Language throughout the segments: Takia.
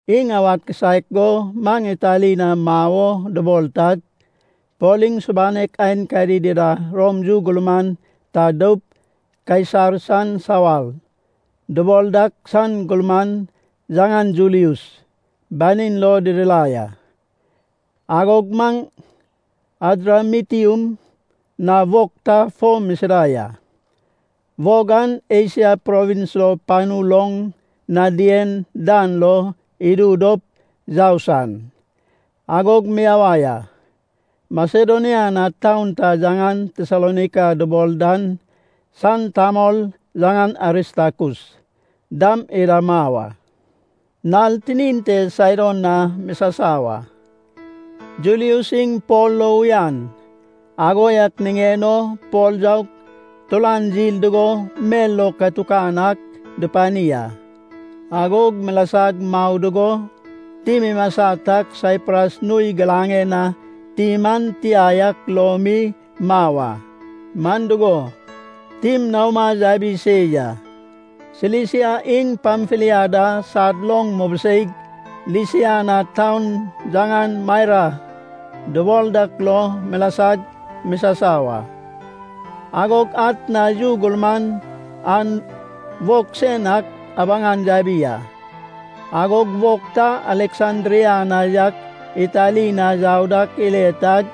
Iŋ awad kisaek go maŋ Itali na mau o dubol tag, Pol iŋ subanek aenkadi dida Rom yu gurman ta doup “Kaisar san sawar” dubol dak san gurman, yaŋan Julius, banin lo didirai a. Agog maŋ Adramitium na wog ta fo misida ya. Wog an Esia provins lo panu loŋ na dien dan lo idu dop yau san. Agog miyawai a. Masedonia na taun ta yaŋan Tesalonaika dubol dan san tamol, yaŋan Aristakus, dam ida mau a. Nal tinin te Saidon na misasau a. Julius iŋ Pol lo uyan, ago yak niŋen o Pol yaug turan yil dugo mel lo katukan ak dupani a. Agog milasag mau dugo tim imasa tag Saipras nui giraŋen na tim an tia yak lo mi mau a, man dugo, tim naoma yabi se ya. Silisia iŋ Pamfilia da sad loŋ mubiseig Lisia na taun yaŋan Maira dubol dak lo milasag misasau a. Agog atna yu gurman an wog sen ak abaŋan yabi a. Agog wog ta Aleksandria na yak Itali na yau dak ile tag,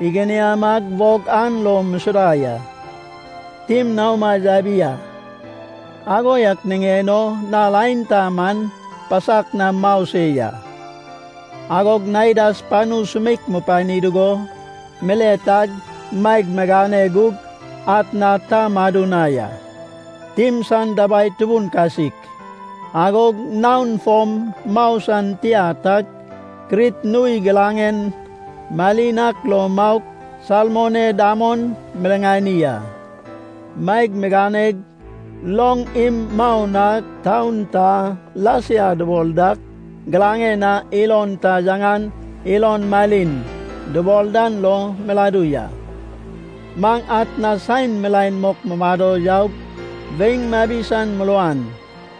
iginiamag wog an lo musuda ya. Tim naoma yabi a, ago yak niŋen o nal aenta man pasak nam mau se ya. Agog Naidas panu sumeik mupani dugo, mile tag maeg migane gug atna ta madu na ya. Tim san dabai tubun kasik, agog naon fom mau san tia tag, Krit nui giraŋen malin ak lo maug Salmone damon miriŋani a. Maeg miganeg loŋ im mau nag taun ta Lasia dubol dak giraŋen na ilon ta yaŋan Ilon Malin dubol dan lo miladu ya. Maŋ atna saen milaen mok mumado yaug weiŋ mabi san muruan.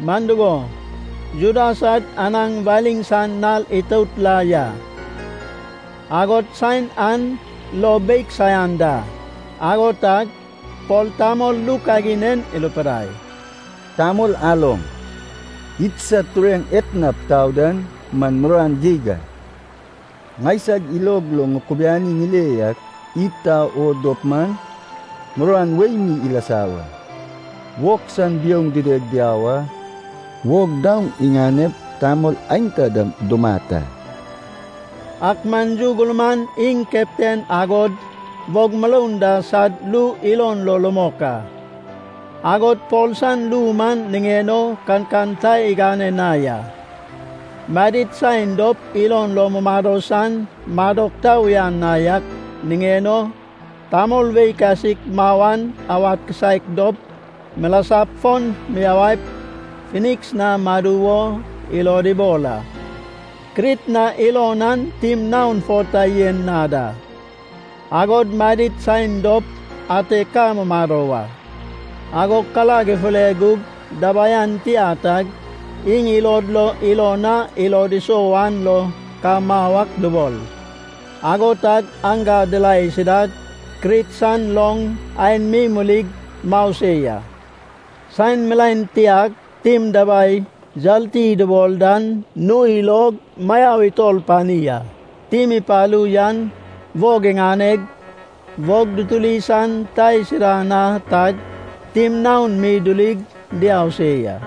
Man dugo, Juda sad anaŋ waliŋ san nal itout la ya, agod saen an lo beig saian da. Ago tag Pol tamol ru kagin en irupidai, “Tamol aloŋ, idsad tureŋ etnap tau dan man muruan geig a. Ŋaisag ilog lo ŋukubiani ŋile yak, id tau oŋ dop man, muruan wei mi ilasa wa, wog san biouŋ dideg diau a, wog daoŋ iŋanep tamol aenta dam dumat a.” Ak man yu gurman iŋ keptan agod wog muroun da sad ru ilon lo rumok a. Agod Pol san ru man niŋen o kankan ta igane na ya. Madid saen dop ilon lo mumado san madok ta uyan na yak niŋen o tamol wei kasik mau an awad kisaek dop, milasap fon miyawaip Finiks na madu wo ilod ibol a. Krit na ilon an tim naon fo ta yen na da. Agod madid saen dop ate ka mumado wa. Agog karag ifure gug dabai an tia tag iŋ ilod lo ilon a ilod isou an lo ka mau ak dubol. Ago tag aŋga dirae isidag Krit san loŋ aen mi murig mau se ya. Saen milaen tiag tim dabai yarti dubol dan nui log mayau itor pani a. Tim ipalu yan wog iŋaneg, wog dutuli san ta isida na tag, tim naon mi dirig diau se ya.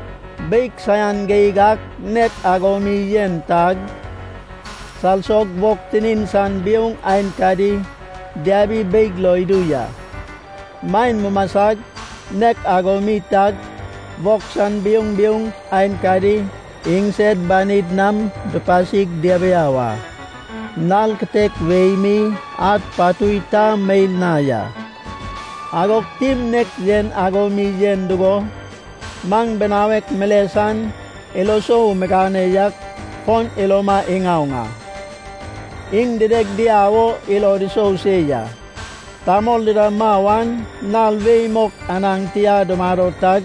Beig saian geig an nek ago mi yen tag, salsog wog tinin san biouŋ aenkadi diabi beig lo idu ya. Maen mumasag nek ago mi tag, wog san biouŋ biouŋ aenkadi iŋsed banid nam dupasig diabiau a. Nal kitek wei mi, ad, patui ta meil na ya. Agog tim nek yen ago mi yen dugo, maŋ binawek mile san ilo isou migane yan fon iloma iŋaoŋ a. Iŋ dideg diau o ilod isou se ya. Tamol dida mau an nal wei mok anaŋ tia dumado tag,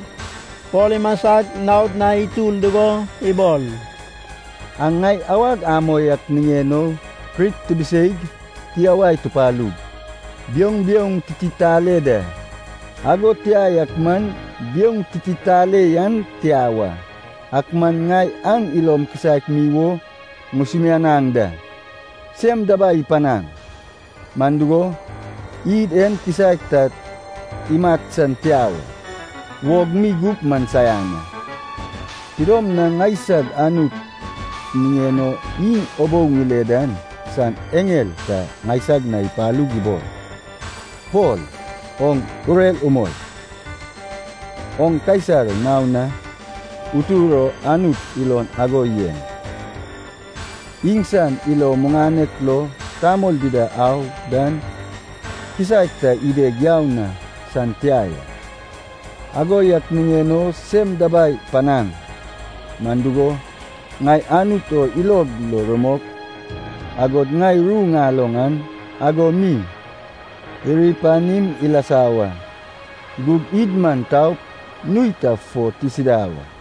Pol imasag naod na itur dugo ibol, “Aŋ ŋai awag amoi ak niŋen o Krit tibiseig, tiyawai tupalug, biouŋ biouŋ tititale da. Ago tia ak man, biouŋ tititale yan tia wa. Ak man ŋai aŋ ilom kisaek mi wo ŋusumianaŋ da. Sem dabai ipanaŋ. Man dugo, id en kisaek ta imat san tia wa. Wog mi gup man saian a. Tidom na ŋaisag Anut niŋen o iŋ ubou ŋile dan san eŋel ta ŋaisag na ipalug ibol, ‘Pol, oŋ urer umoi! Oŋ Kaisar naon na utur o Anut ilon ago yen. Iŋsan ilo muŋanek lo tamol dida au dan kisaek ta ideg yau san tia ya.’ Ago yak niŋen o sem dabai panaŋ. Man dugo, ŋai Anut o ilog lo rumok, agod ŋai ru ŋaloŋ an ago mi iri panim ilasa wa. Gug id man taup nui ta fo tisida wa.”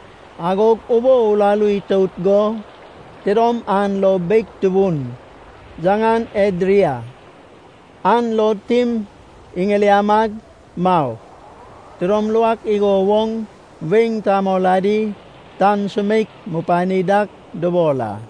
Agog ubou uraru itout go tidom an lo beig tubun, yaŋan Edria, an lo tim iŋiliamag mau. Tidom luak igo woŋ weiŋ tamol adi tan sumeik mupani dak dubol a.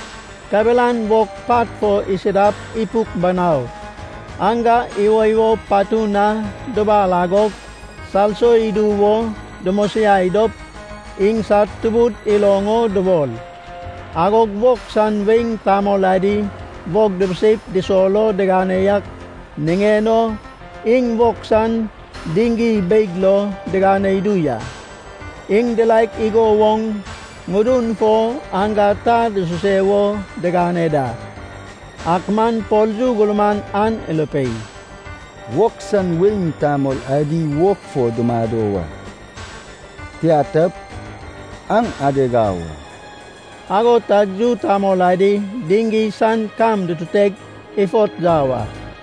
Kabelan wog pat fo isidap ipuk banau aŋga iwoiwo patun na dubal agog salso idu wo dumosiai dop iŋsad tubud iloŋ o dubol. Agog wog san weiŋ tamol adi wog dubiseip dusol o digane yak niŋen o iŋ wog san diŋgi beig lo digane idu ya. Iŋ diraek go wog ŋudun fo aŋga ta dususe wo digane da. Ak man Pol yu gurman an irupei, “Wog san weiŋ tamol adi wog fo dumado wa. Tia tap, aŋ adeg au a.” Ago tag yu tamol adi diŋgi san kam dututeg ifot yau a.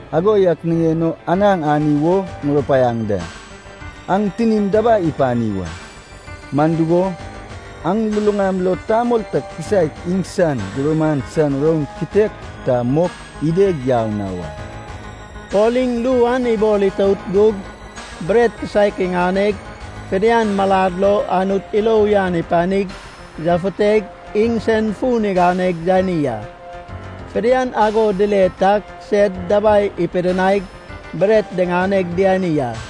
Ago yak niŋen o anaŋ ani wo ŋurupaiaŋ da. An tinim dabai ipani wa. Man dugo, aŋ luluŋam lo tamol ta kisaek iŋsan gumuran san roun kitek ta mok ideg yau na wa.” Pol iŋ ru an ibol itout gug bret kisaek iŋaneg fidian malad lo Anut ilo uyan ipanig yafuteg iŋsen fun iganeg yani a. Fidian ago dile tag sed dabai ipidinaig bret diŋaneg diani a.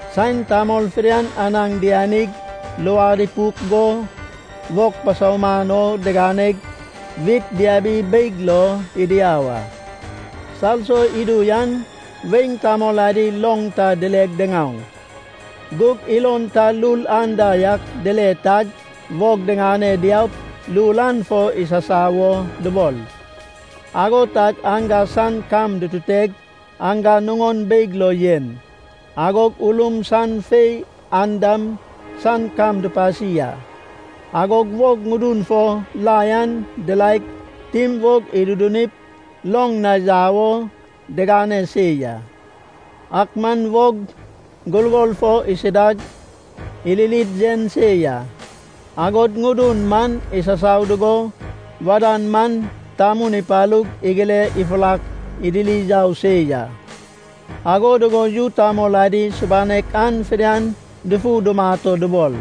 Saen tamol fidian anaŋ dianig, luad ipuk go, wog pasauman o diganeg, wit diabi beig lo idiau a. Salso idu an weiŋ tamol adi loŋ ta dileg diŋaoŋ. Gug ilon ta lul anda yak dile tag wog diŋane diaup lul an fo isasau wo dubol. Ago tag aŋga san kam dututeg, aŋga nuŋon beig lo yen. Agog ulum san fei andam san kam dupasi a. Agog wog ŋudun fo lai an diraeg, tim wog idudunip, loŋ na yau wo digane se ya. Ak man wog gurgor fo isidag iririd yen se ya. Agog ŋudun man isasau dugo wadan man tamun ipalug igile ifurak idiri yau se ya. Ago dugo yu tamol adi subanek an fidian dufu dumat o dubol.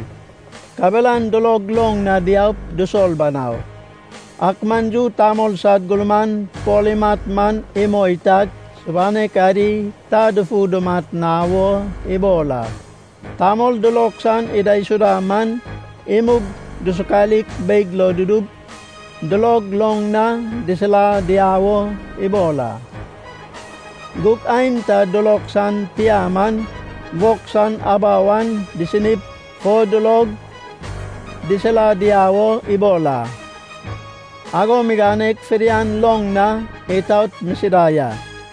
Kabelan dulog loŋ na diaup dusol banau. Ak man yu tamol sad gurman Pol imat man imoi tag, subanek adi ta dufu dumat na wo ibol a. Tamol dulog san idaisuda man imug dusukalik beig lo dudup, dulog loŋ na disila diau o ibol a. Gug aenta dulog san tia man, wog san abau an disinip fo dulog disila diau o ibol a. Ago miganeg fidian loŋ na itaot misida ya.